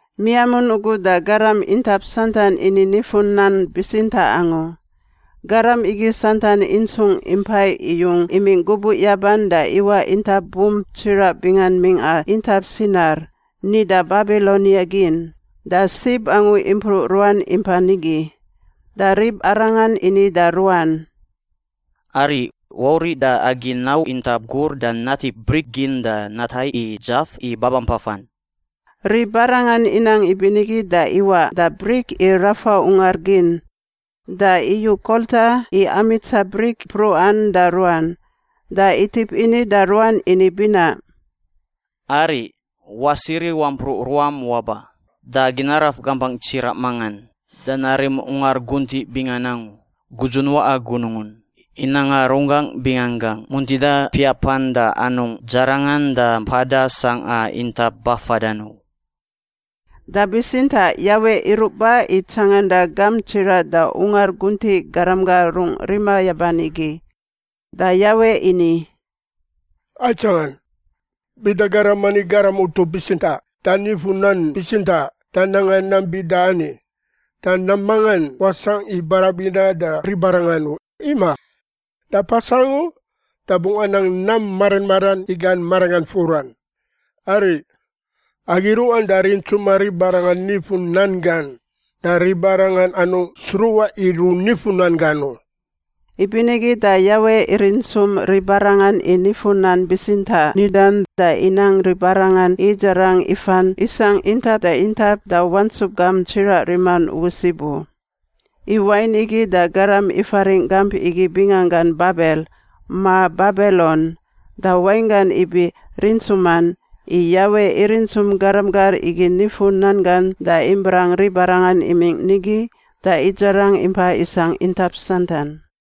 Miamun ugu da garam intap santan ini nifu-nan bitsintaꞌ angu. Garam igi santan intsung impai iyung imingꞌ gubuꞌ yaban da iwaꞌ intap bump tsiraꞌ bingan mingꞌa intap Sinar (nida Babilonia gin) da sib angu impruꞌ ruan impa nigi. Da ribarangan ini da ruan, “Ariꞌ! Wauriꞌ da agi nau intap gur da natip brik gin da natai i dzaf i babampafan.” Ribarangan inang ibinigi da iwaꞌ da brik i rafa ungar gin, da iyu kolta i amitsa brik mpruꞌan da ruan. Da itip ini da ruan ini binaꞌ, “Ariꞌ! Wasiri wampruꞌ ruam waba, da agi naraf gampangꞌ tsiraꞌ mangan da narim ungar guntiꞌ bingan angu, gudzun waꞌa gunungun, i nanga runggangꞌ binganggangꞌ muntida piapan da anungꞌ dzarangan da mpada sangꞌa intap bafadan u.” Da bitsintaꞌ Yawe iruꞌ ba i tsanganda gamp tsiraꞌ da ungar guntiꞌ garam gar rungꞌ rima yaban igi. Da Yawe ini, “Aitsangan! Bida garam ani garam utup bitsintaꞌ da nifu-nan bitsintaꞌ da nanga nam bida ani, da nam mangan wasangꞌ i barabindan da ribarangan u, imaꞌ. Da pas angu da bungꞌ anang nam mara maran i gan maranggan furan. Ariꞌ. Agi ruꞌan da rintsuma ribarangan nifu-nan gan da ribarangan anungꞌ sruꞌa i runifu nan gan u.” Ibinigi da Yawe irintsum ribarangan i nifu-nan bitsintaꞌ nidan, da inang ribarangan idzarang ifan isangꞌ intap da intap da wantsup gamp tsiraꞌ riman ugu sib u. I wain igi da garam ifaringꞌ gamp igi binganggan Babel (ma Babilon), da wainggan ibi rintsuman, i Yawe irintsum garam gar igi nifu-nan gan da ibrang ribarangan imingꞌ nigi da idzarang impa isangꞌ intap santan.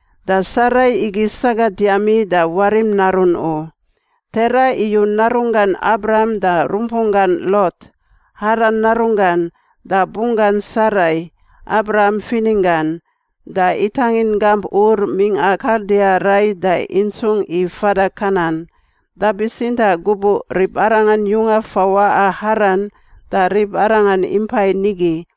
Da Sarai igi sagat yami da warim narun u. Tera iyu narunggan Abram da rumpunggan Lot, Haran narunggan, da bunggan Sarai, Abram fininggan, da itangin gamp Ur mingꞌa Kaldia rai da intsungꞌ i fada Kanan. Da bitsintaꞌ gubuꞌ ribarangan yunga fawaꞌa Haran da ribarangan impai nigi.